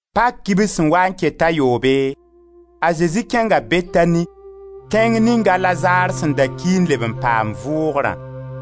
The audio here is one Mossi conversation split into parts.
Pak kibs sẽn waa n ket t'a yoobe, a Zezi kẽnga Betani, tẽng ning a Lazar sẽn da ki n leb n paam vʋʋgrã.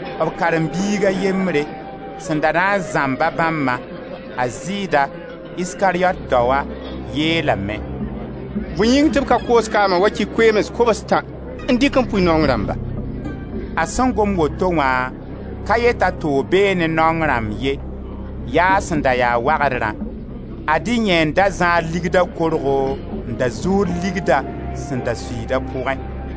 B karen-biig a yembre, sẽn da na n zãmba bãmbã, a Zɩɩda, Iskariyot daoa, yeelame: «Bõe yĩng tɩ b ka koos kaama wakɩ koeems kobs-tã n dɩk n pʋɩ naong rãmba?» A sẽn gom woto wã ka yet t'a toog bee ne naong rãmb ye, yaa a sẽn da ya wagdrã. Ad-y yẽ n da zãad ligda korgo n da zuud ligda sẽn da suiid a pʋgẽ.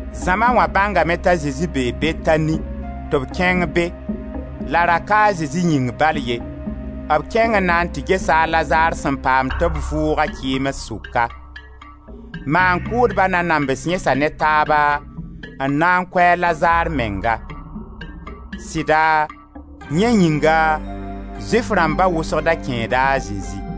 Zãma wã bãngame t'a Zezi bee Betani tɩ b kẽng be, la ra ka a Zezi yĩng bal ye, b kẽng n na n tɩ gesa a Lazar sẽn paam tɩ b vʋʋg-a kɩɩms sʋka. Maan-kʋʋdba nanams yẽsa ne taaba n na n kʋ a Lazar menga. Sɩda, yẽ yĩnga Zʋɩf rãmba wʋsg da kẽeda a Zezi.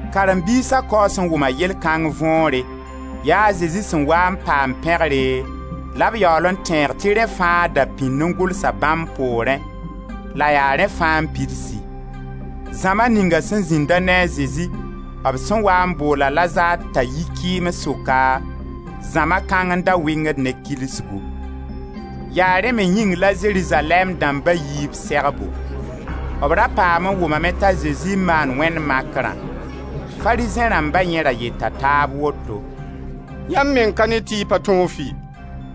Karen-biisa kaoos n wʋma yell kãng võore, yaa a Zezi sẽn waa n paam pẽgre la b yaool n tẽeg tɩ rẽ fãa da pĩnd n gʋlsa bãmb poorẽ, la yaa rẽ fãa n pidsi. Zãma ninga sẽn zĩnda ne a Zezi b sẽn waa n bool a Lazar t'a yi kɩɩms sʋka, zãma kãng n da wɩngd ne kilsgu. Yaa rẽ me yĩng la Zerizalɛɛm dãmba yi b segbo; b ra paam n wʋmame t'a Zezi n maan wẽnd makrã. Farizẽ rãmba yẽ ra yeta taab woto: «Yãmb meng ka ne tɩ y pa tõog fɩ,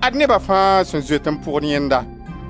ad neba fãa sẽn zoet n pʋgd yẽnda.»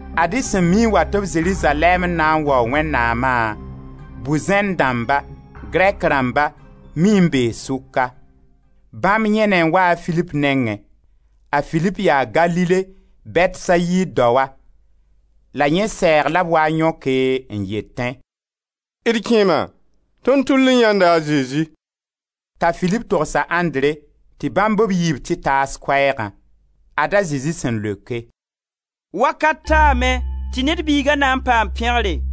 Ad-y sẽn mii n wat-b Zerizalɛɛm n na n waoog Wẽnnaama, bu-zẽnd dãmba, Grɛk rãmba, mii n bee sʋka. Bãmb yẽne n waa a Filip nengẽ. A Filip yaa Galile Bɛtsayid daoa, la yẽ sɛɛg la b waa n yõke, n yetẽ: «D kẽema, tõnd tʋll n yãenda a Zezi.» T'a Filip togs a Andre tɩ bãmb b yiibu tɩ taas koɛɛgã. Ad-a Zezi sẽn leoke: «Wakat taame tɩ Ned Biiga na n paam pẽgre.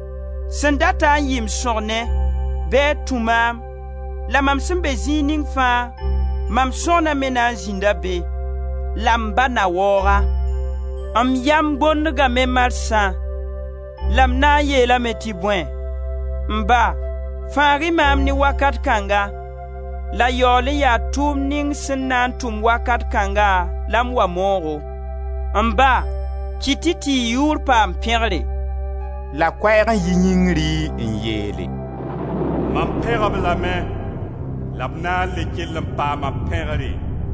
Sẽn dat-a n yɩ m sõgne, bɩ a tũ maam; la mam sẽn be zĩig ning fãa, mam sõgna me na n zĩnda be. La m Ba na waoog-a. M yam bondgame marsã, la m na n yeelame tɩ bõe? M Ba, fãag-y maam ne wakat kãnga. La yaool n yaa tʋʋmd ning sẽn na n tʋm wakat kãnga la m wa moogo. M Ba, kɩt-y tɩ y yʋʋr paam pẽgre!» La koɛɛg n yi yĩngri n yeele: «Mam pẽg-b lame la b na n le kell n paama pẽgre!»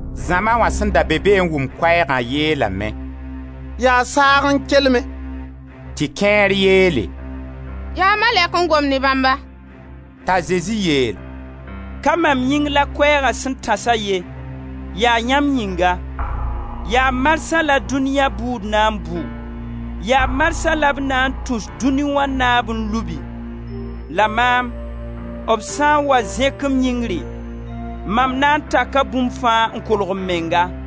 Zãma wã sẽn da be be n wʋm koɛɛgã yeelame: «Yaa saag n kelme!» Tɩ kẽer yeele: «Yaa malɛk n gom ne bãmba!» T'a Zezi yeel: «Ka mam yĩng la koɛɛga sẽn tãsa ye, yaa yãmb yĩnga. Yaa marsã la dũniya bʋʋd na n bʋ; yaa marsã la b na n tus dũni wã Naab n lubi. La maam, b sã n wa zẽk-m yĩngri, mam na n taka bũmb fãa n kolg m menga.»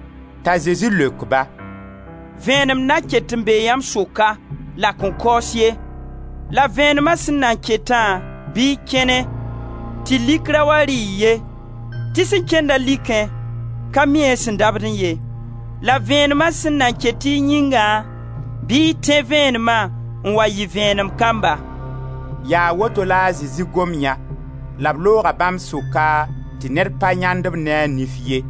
T'a Zezi leok-ba: «Vẽenem nan ket n bee yãmb sʋka, la a kõn kaoos ye, la Vẽenema sẽn nan ketã bɩ y kẽne, tɩ lik ra wa rɩ-y ye tɩ sẽn kẽnda likẽ, ka mi a sẽn dabdẽ ye. La vẽenema sẽn nan ket y yĩngã, bɩ y tẽ vẽenema, n wa yɩ vẽenem kamba.» Yaa woto la a Zezi gom yã, la b looga, bãmb sʋka, tɩ ned pa yãend-b ne a nif ye.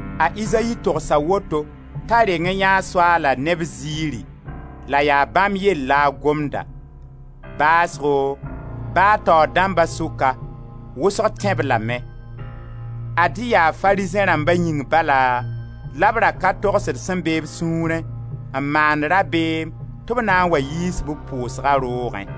A Izayi togsa woto t'a reng n yãee Soaala ne b ziiri la yaa bãmb yell la a gomda. Baasgo, ba taoor dãmba sʋka, wʋsgo tẽ-b lame. Ad-y yaa Farizẽ rãmba yĩng bala, la b ra ka togsd sẽn be b sũurẽ, n maand rabeem tɩ b na n wa yiis b pʋʋsga roogẽ.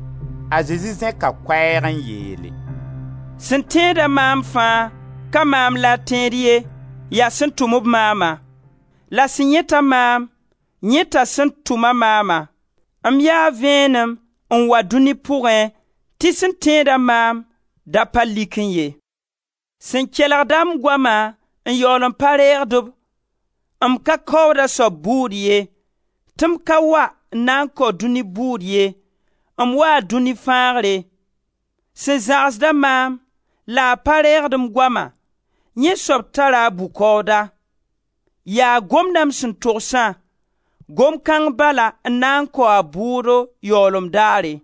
A Zezi zẽka koɛɛg n yeele: «Sẽn tẽed-a maam fãa, ka maam la a tẽed ye, yaa sẽn tʋm-b maama. La sẽn yãet-a maam, yãeta sẽn tʋm-a maama. M yaa vẽenem n wa dũni pʋgẽ tɩ sẽn tẽeda maam da pa likẽ ye. Sẽn kelgd-a m goama n yaool n pa reegd-b, m ka kaood a soab bʋʋd ye tɩ m ka wa n na n kao dũni bʋʋd ye, m waa dũni fãagre. Sẽn zãgsd-a maam, la a pa reegd m goama, yẽ soab tara a bʋ-kaooda: yaa gomdã m sẽn togsã, gom kãng bala n na kao a bʋʋdo yaoolem daare.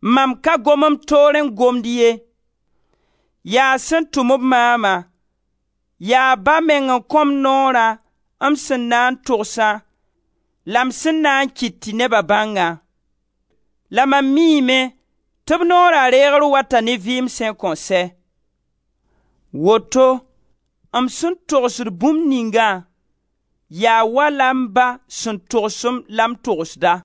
Mam ka gom m toorẽ n gomd ye; yaa sẽn tʋm-b maama, yaa Ba meng n kõ m noorã m sẽn na n togsã la m sẽn na n kɩt tɩ neba bãngã. La mam miime tɩ b noora reegr wata ne vɩɩm sẽn kõn sɛ. Woto m sẽn togsd bũmb ningã, yaa wala m Ba sẽn togs-m la m togsda.»